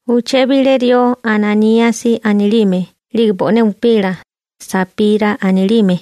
Uché bilé rió Ananíasi anilime 'lige bo'né upila, Sapira anilime,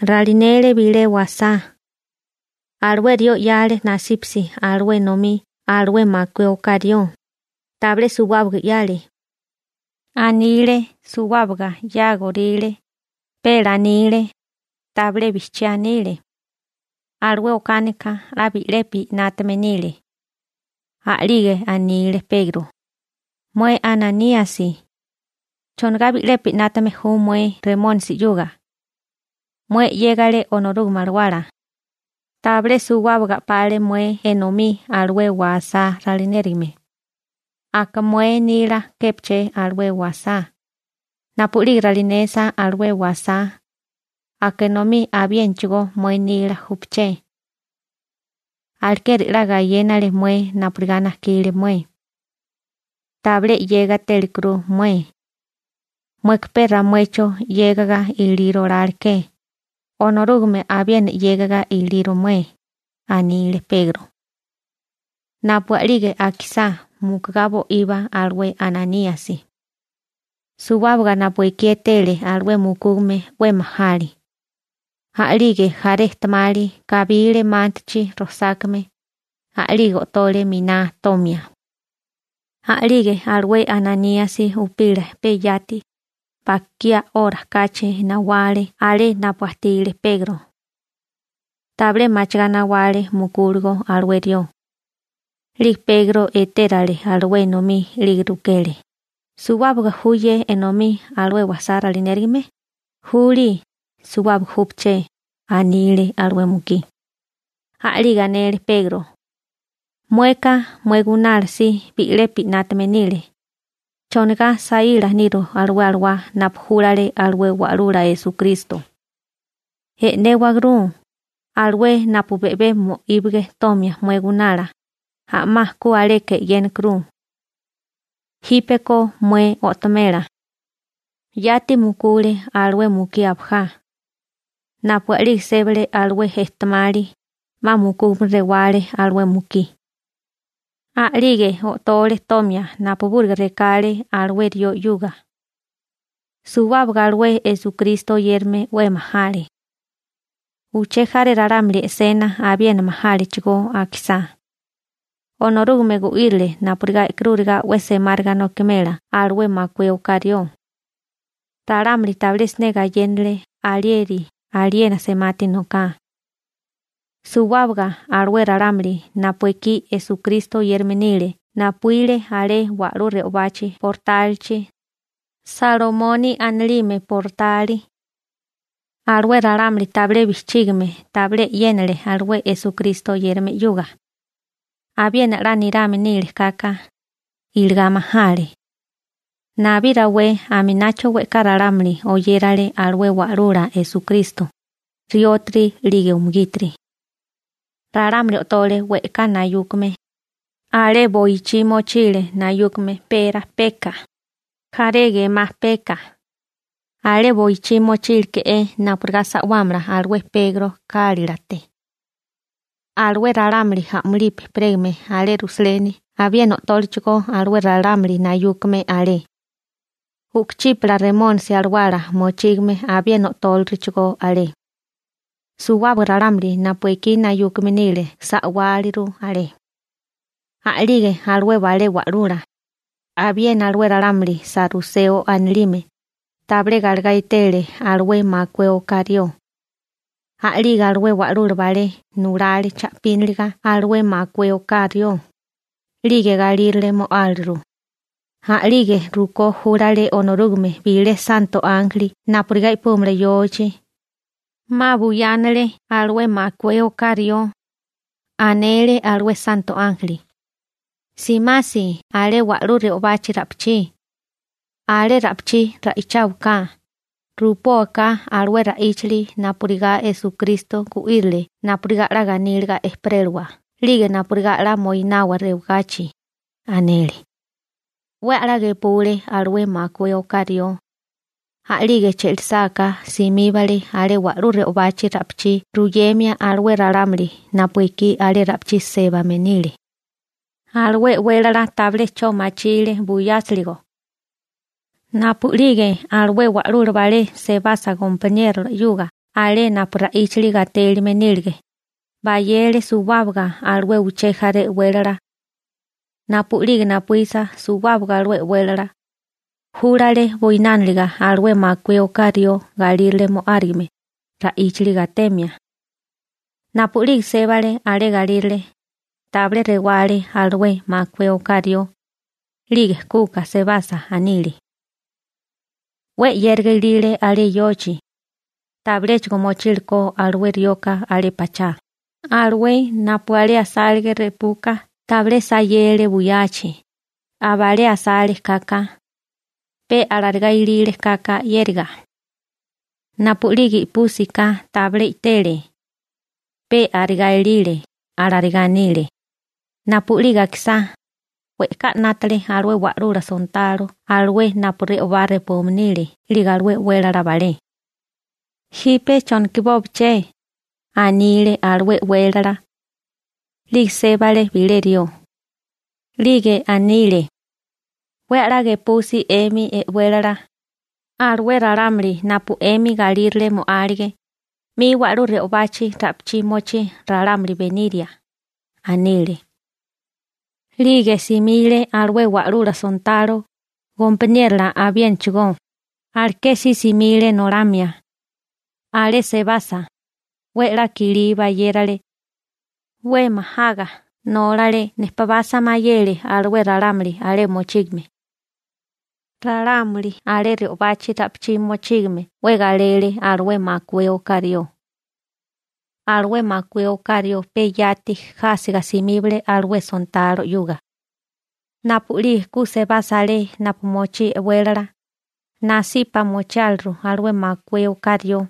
ralinele bilé wasá. Alué rió 'yale nasípasi alué enomí alué makué oká rió, tabilé suwábaga 'yale. Anile suwábaga 'yágoríle, pe lanile, tabilé bijchiá anile. Alué okánika 'la bi'lepi 'nátame nile. A'lige anile Pegro: ―Mué Ananíasi. ¿Chonigá bi'lepi 'nátame ju mué Remónisi 'yuga? Mué 'yégale Onorúgame Alawala. Tabilé suwábaga a'pale mué enomí alué wasá ralinérigame. ¿Aka mué nila képaché alué wasá? Napu'lige ralinesa alué wasá, aka enomí abiénachigó mué nila júpeché. Alekeri 'la gayénale mué napurigá najkile mué. Tabilé 'yégatélikuru mué. Mueka pe ramuecho 'yégaga iliro oláleké, Onorúgame abiena 'yégaga iliro mué ―anile Pegro. Napu a'lige akisá, mukugá bo'iba alué Ananíasi. Suwábaga napu ekí e'tele alué mukúgame 'we majale. A'lige jaré ejtemali kabile mántachi rosákame, a'lige o'tole miná tomia. A'lige alué Ananíasi upila peyati, bakiá 'ora kachi, nawale alé napu ajtile Pegro. Tabilé machigá nawale mukúligo alué rió. 'Lige Pegro etérale alué enomí 'lige rukele: ―¿Suwábaga ju ye enomí alué wasá ralinérigame? ―Juli, suwábaga júpeché ―anile alué mukí. A'lige anele Pegro: ―Mueka, mué gunala si bi'lepi 'nátame nile. ¿Chonigá saíla niru alué Alawá napu júlale alué Wa'lula Esukristo? ¡E'néwagrú! Alué napu be'bé mo'íbage tomia mué gunala, a'má ku aleka e'yénakuru. Jípeko mué o'tomela. Yati mukule alué mukí abajá. Napu a'lige sébale alué ejtemali, 'ma mukúgame rewale alué mukí. A'lige o'tole tomia napubúriga rekale alué rió 'yuga. Suwábaga alué Esukristo oyérame 'we majale. Uché jaré ralámuli e'sena abiena majálechigó akisá. Onorúgame gu'írile napurigá e'karúriga 'we semáriga nokimela alué makué oká rió. Ralámuli tabilé siné gayénale alieri aliena semati noká. Suwábaga alué ralámuli napu ekí Esukristo oyérame nile napuíle alé wa'lú re'obachi bortálichi, Salomoni anilime bortali. Alué ralámuli tabilé bijchígame tabilé e'yénale alué Esukristo oyérame 'yuga. Abiena 'la nirame nile kaka, iligá majale. Nabí rawé aminacho we'ká ralámuli oyérale alué Wa'lula Esukristo, riótiri 'lige umugítiri. Ralámuli o'tole we'ká nayúkame, alé boichí mochile nayúkame pera (petate) peka, jaré gemá peka. Alé boichí mochíleke'é napurigá sa'wámala alué Pegro kálilate. Alué ralámuli a'mulipi ejperégame alé Rusaleni abiena o'tólechigó alué ralámuli nayúkame alé. U'kuchípala remónisi alawala mochígame abiena o'tóliruchigó alé. Suwábaga ralámuli napu ekí nayúkame nile sa'wáliru alé. A'lige alué balé wa'lula, abiena alué ralámuli saruseo anilime, tabilé galegá etele alué makué oká rió. A'lige alué wa'lula balé nulale cha'píniliga alué makué oká rió, 'lige galírale mo'áliru. A'lige rukó júlale Onorúgame bilé santo ánjeli napurigá i'púmala yochi. 'Ma buyánale alué makué oká rió. Anele alué santo ánjeli: ―Simasi alé wa'lú re'obachi ra'pichí. Alé ra'pichí ra'icháwaká, rupóká alué ra'íchali napurigá Esukristo gu'írile napurigá 'la ganíliga ejperélawa 'lige napurigá 'la moinawa rewagachi ―anele. 'We a'lá gepule alué makué oká rió. A'lige che'lisáká simíbale alé wa'lú re'obachi ra'pichí ruyemia alué ralámuli napu ekí alé ra'pichí sébame nile. Alué e'wélala tabilé 'cho machile buyásiligo. Napu'lige alué wa'lula balé sebasa gompaniérola 'yuga alé napu ra'íchali gatélime nílige, bayele suwábaga alué uché jaré e'wélala. Napu'lige napuísa suwábaga alué e'wélala, júlale buinániliga alué makué oká rió galírale mo'árigime ra'íchali gatemia. Napu'lige sébale alé galírale, tabilé rewale alué makué oká rió, 'lige kuka sebasa anile: ―'We 'yériga ilile alé yochi, tabiléchigo mochile ko alué rioka alé pachá. Alué napu alé asálige repuka tabilé sayele buyachi, abalé asale kaka. Pe alarigá ilile kaka 'yériga. Napu'lige i'púsiká tabilé i'tele. Pe arigá ilile ―alarigá anile. Napu'lige akisá, we'ká 'nátale alué wa'lula sontalo alué napu re'obá repume nile 'lige alué e'wélala balé. ―¿Jipe chonokibóbeché? ―anile alué e'wélala. 'Lige sébale bilé rió. 'Lige anile: ―'We a'lá gepusi 'emi e'wélala. Alué ralámuli napu 'emi galírale mo'álige, 'mi wa'lú re'obachi ra'pichí mochí ralámuli beniria ―anile. 'Lige simile alué wa'lula sontalo, gompaniérola abiénachigó, aleké si simile nolamia. Alé sebasa, 'we 'la kilí bayérale. 'We majaga nólale nepabasa mayele alué ralámuli alé mochígame. Ralámuli alé re'obachi ra'pichí mochígame 'we galele alué makué oká rió. Alué makué oká rió pe yati jásiga simíbale alué sontalo 'yuga. Napu'lige ku sebasa alé napu mochí e'wélala, nasipa mochiáliru alué makué oká rió.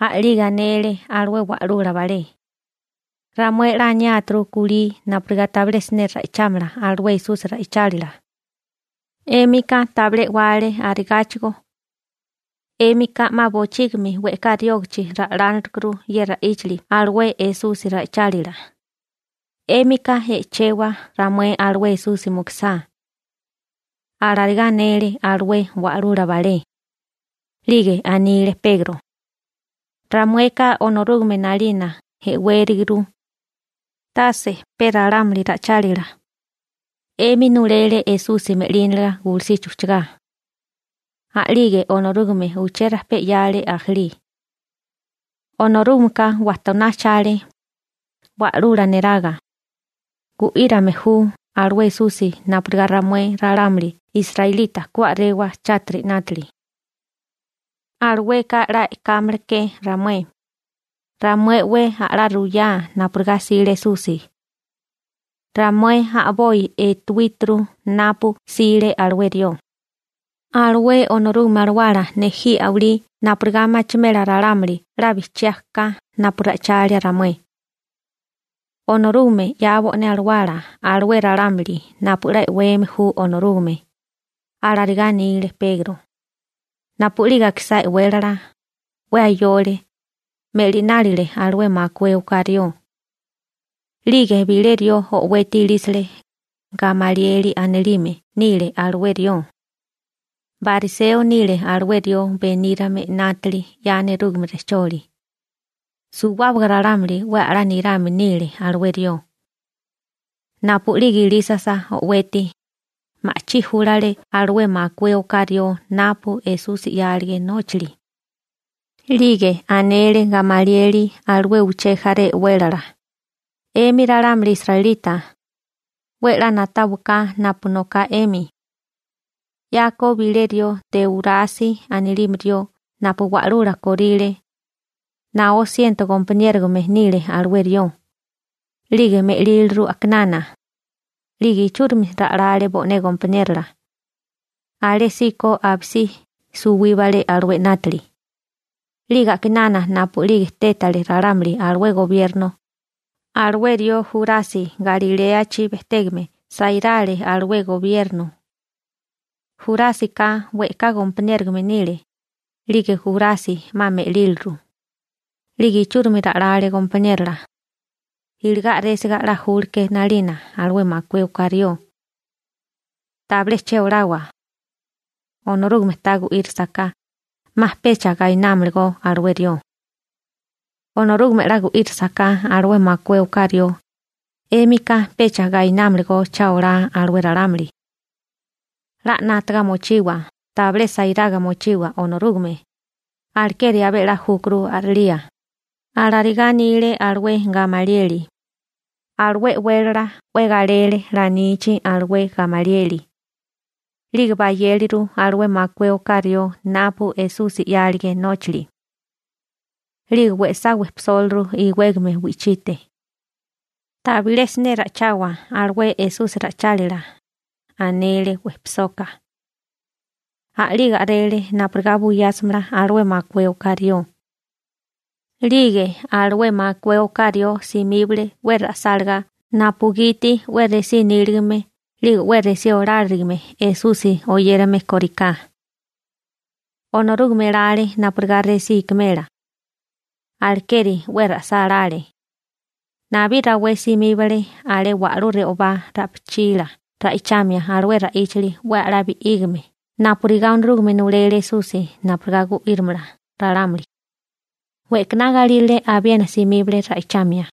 A'lige anele alué wa'lula balé: ―Ramué 'la aniáturu kulí napurigá tabilé siné ra'ichámala alué Esusi ra'ichálila. 'Émika tabilé e'wale arigáchigó. 'Émika 'ma bochígimi we'ká riógichi ra'lánalekuru ye ra'íchali alué Esusi ra'ichálila. ¡'Émika e'chewa ramué alué Esusi mukusá! ―alarigá anele alué wa'lula balé. 'Lige anile Pegro: ―¡Ramueka Onorúgame 'nalina e'wériguru, tase pe ralámuli ra'ichálila! 'Emi nulele Esusi me'líniliga gulusichi ujchagá. A'lige Onorúgame uché rajpé 'yale ajalí. Onorúgameka wajtoná ajchale Wa'lula neraga. Gu'írome ju alué Esusi napurigá ramué ralámuli israelita ku a'rewa chátiri 'nátili. Alueka 'la e'kámala ke ramué. Ramué 'we a'lá ruyá napurigá 'sile Esusi. Ramué a'boi etewíturu napu 'sile alué rió. Alué Onorúgame Alawala nejí a'walí napurigá machimela ralámuli 'la bijchiá ka napu ra'ichalia ramué. Onorúgame 'ya bo'né Alawala alué ralámuli napu 'la e'weme ju Onorúgame ―alarigá anile Pegro. Napu'lige akisá e'wélala, 'we ayole, me'linálile alué makué oká rió. 'Lige bilé rió o'weti ilísile, Gamalieli anilime nile alué rió. Bariseo nile alué rió benírame 'nátili 'ya nerúgame rejcholi. Suwábaga ralámuli 'we a'lá nirame nile alué rió. Napu'lige ilísasa o'weti, ma'chí júlale alué makué oká rió napu Esusi 'yálige nóchali. 'Lige anele Gamalieli alué uché jaré e'wélala: ―'Emi ralámuli israelita, 'we 'la na'táwaká napu noká 'emi. 'Yako bilé rió Teúrasi anilime rió napu wa'lula kóríle, naó siento gompaniérogame nile alué rió. 'Lige me'líliru a'kinana. 'Lige ichúrimi ra'lale bo'né gompaniérola. Alésíko abisí suwíbale alué 'nátili. 'Lige a'kinana napu'lige tétale ralámuli alué gobierno, alué rió Jurasi Galiléachi bejtégame sairale alué gobierno. Jurásika we'ká gompaniérogame nile. 'Lige Jurasi 'ma me'líliru. 'Lige ichúrimi ra'lale gompaniérola. Iligá a'résiga 'la júleké 'nalina alué makué oká rió. Tabilé che olawa. Ye ralámuli pe a'bopi 'nátaga alanokagá e'yénasaká, 'ma pe suwibámala alué 'nátali. Onorúgame 'la gu'írisaká alué makué oká rió, 'émika pecha umubámalagó cha olá alué ralámuli. 'La 'nátaga mochiwa, tabilé sairaga mochiwa Onorúgame. Alekeri abé 'la júkuru a'rilía ―alarigá anile alué Gamalieli. Alué e'wélala 'we galele lanichi alué Gamalieli. 'Lige bayéleru alué makué oká rió napu Esusi 'yálige nóchali. 'Lige we'sá wejpisóliru iwégame wi'chite. ―Tabilé siné ra'ichawa alué Esusi ra'ichálila ―anele wejpisoka. A'lige a'rele napurigá buyásimala alué makué oká rió. 'Lige alué makué oká rió simíbale 'we ra'sálagá napugiti 'we resí níligame 'lige 'we resí oláriligime Esusi oyérame koriká. Onorúgame elale napurigá resí ikimela. Alekeri 'we ra'sálále. Nabí rawé simíbale alé wa'lú re'obá ra'pichila ra'ichamia alué ra'íchali 'we a'lá bi'ígame napurigá Onorúgame nulele Esusi napurigá gu'írimala ralámuli. We'kaná galírale abiena simíbale ra'ichamia.